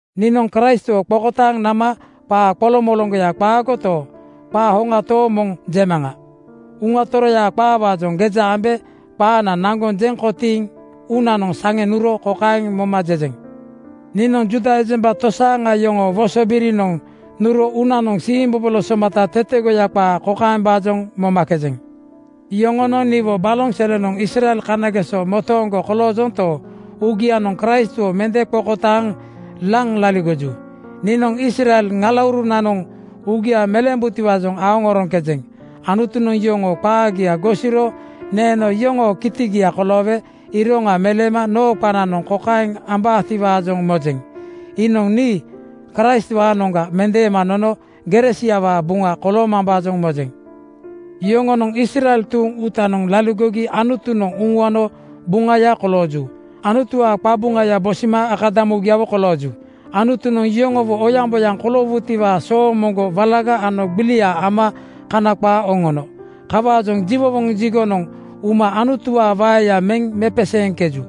Niinoŋ Kraistwo qokotaaŋ nama qaa qoloŋmoloŋgoya qaagoto, qaa hoŋa tooŋ moŋ jemaŋa. Uŋa Toroyaa qaawaajoŋ geja ambe qaana naŋgoŋ jeŋ kotiiŋ uunanoŋ saŋe nuro kokaeŋ moma jejeŋ: Niinoŋ Juuda ejemba tosaaŋa yoŋoo wosobirinoŋ nuro uunanoŋ siimbobolo somata tetegoya qaa kokaembaajoŋ momakejeŋ: Yoŋonoŋ niwo baloŋ selenoŋ Israel kanagesoga motooŋgo koloojonto, uugianoŋ Kraistwo mende qokotaaŋ laŋ laligoju. Niinoŋ Israel ŋalaurunanoŋ uugia meleembutiwaajoŋ aoŋoroŋkejeŋ. Anutunoŋ yoŋoo qaagia gosiro neeno yoŋoo kitigia koloowe iroŋa meleema noo qananoŋ kokaeŋ ubaatiwaajoŋ mojeŋ: Iinoŋ nii Kraistwaanoŋga mendeema nono gere siawaa buŋa koloomambaajoŋ mojeŋ. Yoŋonoŋ Israel tuuŋ uutanoŋ laligogi Anutunoŋ uŋuano buŋaya kolooju. Anutuwaa qabuŋaya bosima akadamugiawo kolooju. Anutunoŋ yoŋowo oyaŋboyaŋ koloowutiwaa soomoŋgo walaga ano gbilia ama Kana qaa oŋono. Kawaajoŋ jiwowoŋ jigonoŋ uma Anutuwaa waeya meŋ mepeseeŋkeju.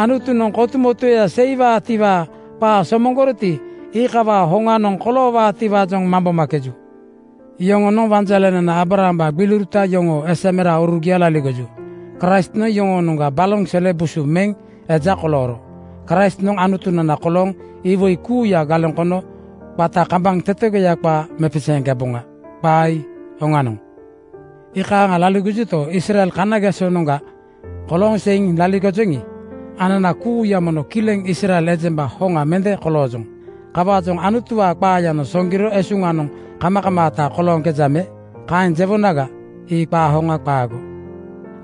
Anutunoŋ kotumotueya seiwaatiwaa qaa somoŋgoroti, iikawaa hoŋanoŋ koloowaatiwaajoŋ mambomakeju. Yoŋonoŋ wanjalenana Aabrahambaa gbiliuruta yoŋoo esa meraurugiaga laligoju. Kraistnoŋ yoŋoonoŋga baloŋ sele busu meŋ eja kolooro. Kraistnoŋ Anutunana kolooŋ iwoi kuuya galeŋ kono qata kambaŋ tetegoya qaa mepeseeŋkeboŋa. Qaa ii oŋanoŋ. Iikaaŋa laligojuto, Israel kanagesonoŋga kolooŋ seiŋ laligojoŋi, anana kuuya mono kileŋ Israel ejemba hoŋa mende koloojoŋ. Kawaajoŋ Anutuwaa qaayanoŋ soŋgiro esuŋanoŋ kamakamaata kolooŋkeja me? Kaeŋ jewonaga, ii qaa hoŋa qaago.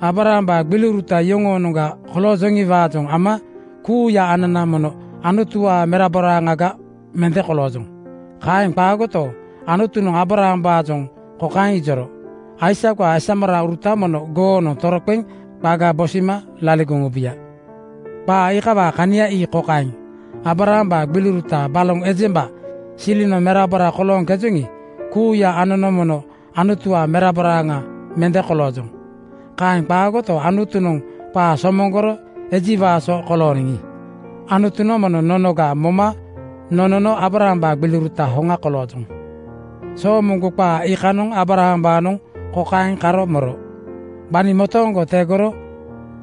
Aabrahambaa gbiliuruta yoŋoonoŋga koloojoŋiwaajoŋ ama kuuya anana mono Anutuwaa meraboraaŋaga mende koloojoŋ. Kaeŋ qaagoto, Anutunoŋ Aabrahambaajoŋ kokaeŋ ijoro, “Aisakwaa esameraurutanoŋ mono goonoŋ toroqeŋ qaga bosima laligoŋ ubuya.” Qaa iikawaa kania ii kokaeŋ: Aabrahambaa gbiliuruta baloŋ ejemba silinoŋ merabora kolooŋkejoŋi, kuuya anono mono Anutuwaa meraboraaŋa mende koloojoŋ. Kaeŋ qaagoto, Anutunoŋ qaa somoŋgoro ejiwaa so kolooniŋi, Anutunoŋ mono nonoga moma nonono Aabrahambaa gbiliuruta hoŋa koloojoŋ. Soomoŋgo qaa iikanoŋ Aabrahambaanoŋ kokaeŋ karo moro, “Gbani motooŋgo tegoro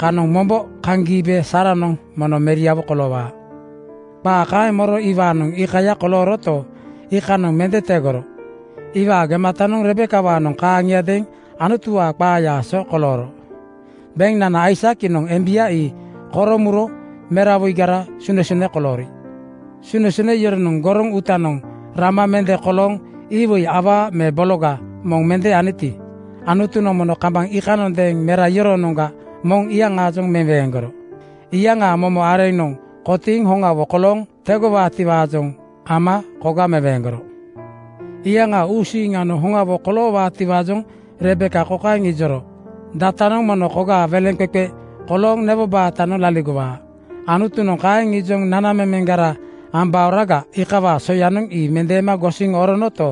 kanoŋ mombo kaŋ giibe Saaranoŋ mono meriawo koloowaa.” Qaa kaeŋ moro iwaanoŋ iikaya kolooroto, iikanoŋ mende tegoro. Iwaa gematanoŋ Rebekawaanoŋ kaaŋiadeeŋ Anutuwaa qaayaa so kolooro. Beŋnana Aisak iinoŋ embia ii koro muro merawoigara sunesune koloori. Sunesune yoronoŋ goroŋ uutanoŋ rama mende kolooŋ iwoi awaa me bologa moŋ mende aniti, Anutunoŋ mono kambaŋ iikanoŋ mera iyoroonoŋga moŋ iyaŋaajoŋ meweeŋgoro. Iyaŋaa momo areŋanoŋ kotiiŋ hoŋawo kolooŋ tegowaatiwaajoŋ ama koga meweeŋgoro. Iyaŋaa uusiiŋanoŋ hoŋawo koloowaatiwaajoŋ Rebeka kokaeŋ ijoro, “Datanoŋ mono kogaa weleŋqeqe kolooŋ newo baatanoŋ laligowaa.” Anutunoŋ kaeŋ ijoŋ nanamemeŋgara ambaoraga iikawaa soyanoŋ ii mende gosiŋ oronoto,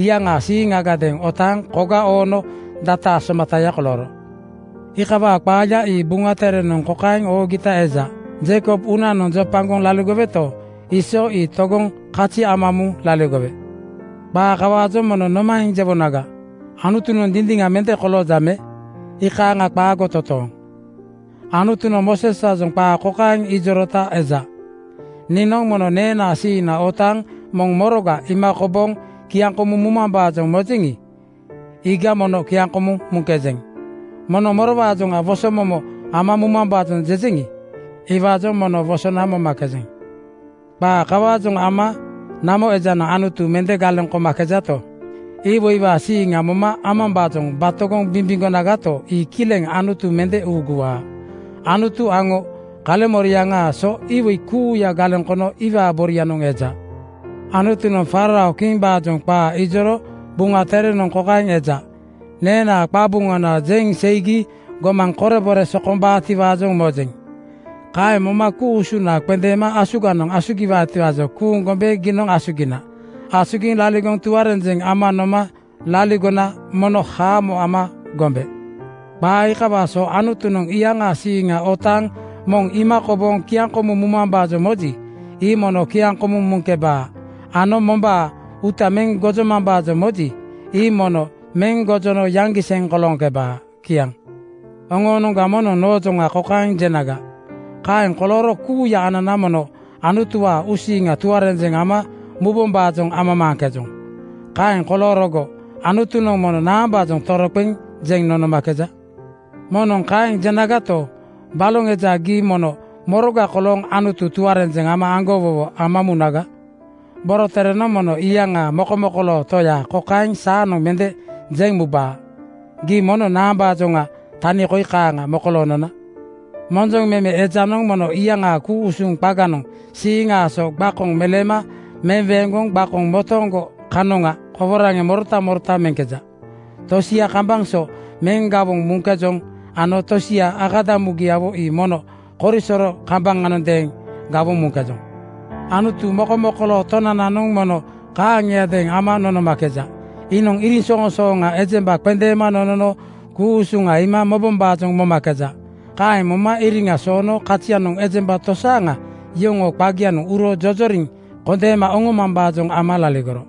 iyaŋaa siiŋagadeeŋ otaaŋ koga oono dataa somataya kolooro. Iikawaa qaaya ii Buŋa Terenoŋ kokaeŋ oogita eja, “Jeikob uunanoŋ jopagoŋ laligoweto, Iisoo (Esau) ii togoŋ kazi ama muŋ laligowe.” Qaa kawaajoŋ mono nomaeŋ jewonaga? Anutunoŋ dindiŋa mende kolooja me? Iikaaŋa qaago totooŋ! Anutunoŋ Mooseswaajoŋ qaa kokaeŋ ijorota eja, “Niinoŋ mono neenaa siiŋna otaaŋ moŋ moroga iima kobooŋ kiaŋkomumambaajoŋ mojeŋi, iiga mono kiaŋkomuŋ muŋkejeŋ. Moŋ morowaajoŋ wosomomo ama mumambaajoŋ jejeŋi, iwaajoŋ mono wosona momakejeŋ.” Qaa kawaajoŋ ama namo ejanoŋ Anutu mende galeŋ komakejato, iwoiwaa siiŋa moma amambaajoŋ batogoŋ bimbimgonagato, ii kileŋ Anutu mende uuguwaa. Anutu aŋo kaleŋmoriaŋaa so iwoi kuuya galeŋ kono iwaa borianoŋ eja. Anutunoŋ faarao kimbaajoŋ qaa ijoro Buŋa Terenoŋ kokaeŋ eja, “Neenaa qabuŋana jeŋ seigi gomaŋ korebore sokombaatiwaajoŋ mojeŋ. Kaeŋ moma ku-usuna qendeembe asuganoŋ asugiwaatiwaajoŋ kuuŋ gombe giinoŋ asugina. Asugiŋ laligoŋ tuarenjeŋ ama noma laligona mono haamo ama gombe.” Qaa iikawaa so Anutunoŋ iyaŋaa siiŋa otaaŋ moŋ iima kobooŋ kiaŋkomumambaajoŋ moji, ii mono kiaŋkomuŋ muŋkebaa ano mombaa uuta meŋ gojomambaajoŋ moji, ii mono meŋ gojono yaŋgiseŋ kolooŋkebaa. Kiaŋ. Oŋoonoŋga moŋnoŋ noojoŋa kokaeŋ jenaga, “Kaeŋ kolooro kuuya anana mono Anutuwaa uusiiŋa tuarenjeŋ ama mubombaajoŋ amamaaŋkejoŋ. Kaeŋ koloorogo Anutunoŋ mono naambaajoŋ toroqeŋ jeŋ nonomakeja?” Moŋnoŋ kaeŋ jenagato, baloŋ eja gii mono moroga kolooŋ Anutu tuarenjeŋ ano aŋgowowo ama munaga? Boroterenoŋ mono iyaŋaa mokomokoloo Toya kokaeŋ saanoŋ mende jeŋ mubaa, “Gii mono naambaajoŋa tani koi kaaŋa mokolooŋ nona?” Monjoŋ meme ejanoŋ mono iyaŋaa ku-usuŋ qaganoŋ siiŋaa so gbakoŋ meleema meweeŋgoŋ gbakoŋ motooŋgo kanoŋa koworaŋeŋ morota morota meŋkeja. Tosia kambaŋ so meŋ gawoŋ muŋkejoŋ ano tosia akadamugiawo ii mono korisoro kambaŋanoŋadeeŋ gawoŋ muŋkejoŋ. Anutu mokomokoloo Tonananoŋ mono kaaŋiadeeŋ ama nonomakeja. Iinoŋ iriŋsoŋsooŋa ejemba qendeema nonono ku-usuŋa iima mobombaajoŋ momakeja. Kaeŋ moma iriŋa soono kazianoŋ ejemba tosaaŋa yoŋoo qagianoŋ uro jojoriŋ kondeema oŋomambaajoŋ ama laligoro.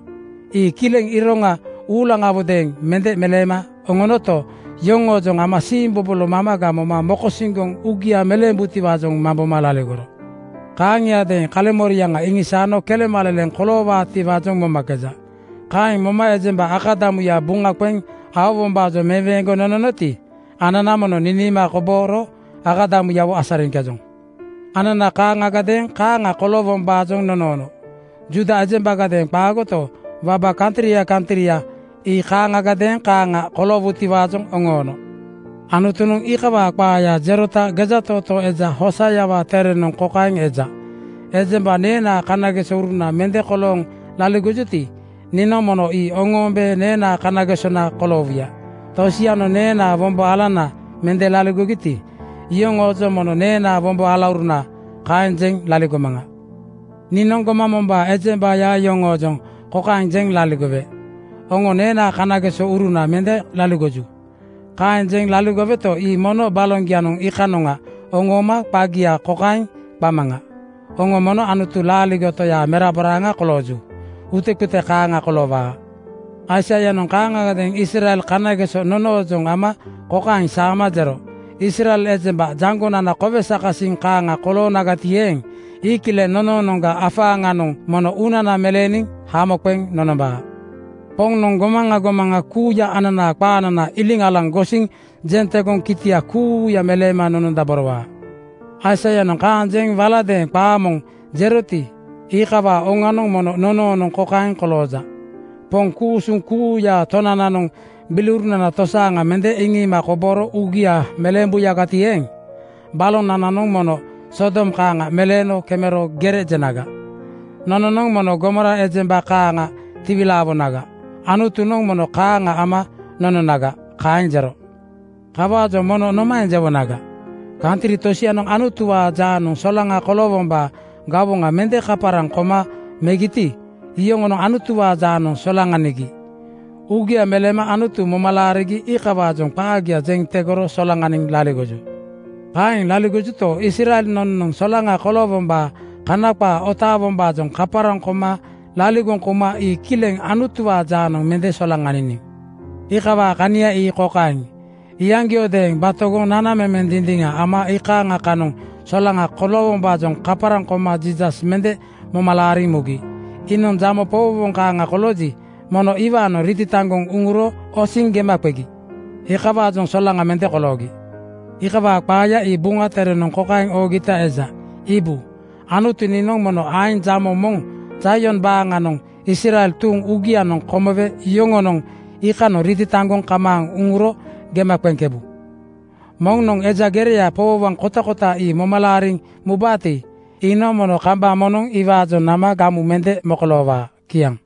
Ii kileŋ iroŋa uulaŋawodeeŋ mende meleema oŋonoto, yoŋoojoŋ ama siimbobolo mamaga moma mokosiŋgoŋ uugia meleembutiwaajoŋ mamboma laligoro. Kaaŋiadeeŋ kaleŋmoriaŋa iŋisaano kelemaleleŋ koloowaatiwaajoŋ momakeja. Kaeŋ moma ejemba akadamuya buŋa qeŋ aowombaajoŋ meweeŋgoŋ nononoti, anana mono niniima kobooro akadamuyawo asariŋkejoŋ. Anana kaaŋagadeeŋ kaaŋa koloowombaajoŋ nonoono. Juuda ejembagadeeŋ qaagoto, waba kantria kantria ii kaaŋagadeeŋ kaaŋa koloowutiwaajoŋ oŋoono. Anutunoŋ iikawaa qaaya jerota gejatootoo eja Hooseawaa terenoŋ kokaeŋ eja, “Ejemba neenaa kanagesouruna mende kolooŋ laligogiti, niinoŋ mono ii oŋoombe neenaa kanagesona koloowuya. Tosianoŋ neenaa wombo alana mende laligogiti, iyoŋoojoŋ mono ‘Neenaa wombo alauruna,’ kaeŋ jeŋ laligomaŋa. Niinoŋ gomaŋ mombaa ejembaya yoŋoojoŋ kokaeŋ jeŋ laligowe, ‘Oŋo neenaa kanagesouruna mende laligoju.’ Kaeŋ jeŋ laligoweto, ii mono baloŋgianoŋ iikanoŋa oŋooma qagia kokaeŋ qamaŋa: Oŋo mono Anutu laaligo Toyaa meraboraaŋa kolooju. Utequte kaaŋa koloowaa.” Aisaianoŋ kaaŋagadeeŋ Israel kanageso nonoojoŋ ama kokaeŋ saama jero, “Israel ejemba jaŋgonana kowe sakasiŋ kaaŋa koloonagati eeŋ, ii kileŋ nonoonoŋga afaaŋanoŋ mono uunana meleeniŋ hamo qeŋ nonombaa. Poŋnoŋ gomaŋa gomaŋa kuuya ananaa qaanana iliŋ alaŋ gosiŋ jeŋ tegoŋ kitia kuuya meleema nonondaborowaa.” Aisaianoŋ kaeŋ jeŋ waladeeŋ qaa moŋ jeroti, iikawaa oŋanoŋ mono nonoonoŋ kokaeŋ kolooja, “Poŋ ku-usuŋ kuuyaa Tonananoŋ gbiliurunana tosaaŋa mende iŋiima kobooro uugia meleembuyagati eeŋ, balonananoŋ mono Sodom kaaŋa meleeno kemero gere jenaga. Nononoŋ mono Gomora ejemba kaaŋa tiwilaawonaga. Anutunoŋ mono kaaŋa ama nononaga.” Kaeŋ jero. Kawaajoŋ mono nomaeŋ jewonaga? Kantri tosianoŋ Anutuwaa jaanoŋ solaŋa koloowombaa gawoŋa mende kaparaŋ koma megiti, iyoŋonoŋ Anutuwaa jaanoŋ solaŋanigi. Uugia meleema Anutu moma laarigi iikawaajoŋ qaagia jeŋ tegoro solaŋaniŋ laligoju. Kaeŋ laligojuto, Israel nononoŋ solaŋa koloowombaa Kana qaa otaawombaajoŋ kaparaŋ koma laligoŋ kouma ii kileŋ Anutuwaa jaanoŋ mende solaŋaniniŋ. Iikawaa kania ii kokaeŋ: Iyaŋgiodeeŋ batogoŋ nanamemeŋ dindiŋa ama iikaaŋa kanoŋ solaŋa koloowombaajoŋ kaparaŋ koma Jiisas mende moma laariŋ mugi. Iinoŋ jamo powowoŋ kaaŋa kolooji, mono iwaanoŋ ritataŋgoŋ uŋuro osiŋ gema qegi. Iikawaajoŋ solaŋa mende koloogi. Iikawaa qaaya ii Buŋa Terenoŋ kokaeŋ oogita eja, “Iibu, Anutu niinoŋ mono aeŋ jamo moŋ Zaion baaŋanoŋ Israel tuuŋ uugianoŋ komowe yoŋonoŋ iikanoŋ ritataŋgoŋ kamaaŋ uŋuro gema qeŋkebu. Moŋnoŋ eja gereya powowoŋ kotakota ii moma laariŋ mubaati, iinoŋ mono kambaŋ moŋnoŋ iwaajoŋ nama gamu mende mokoloowaa.” Kiaŋ.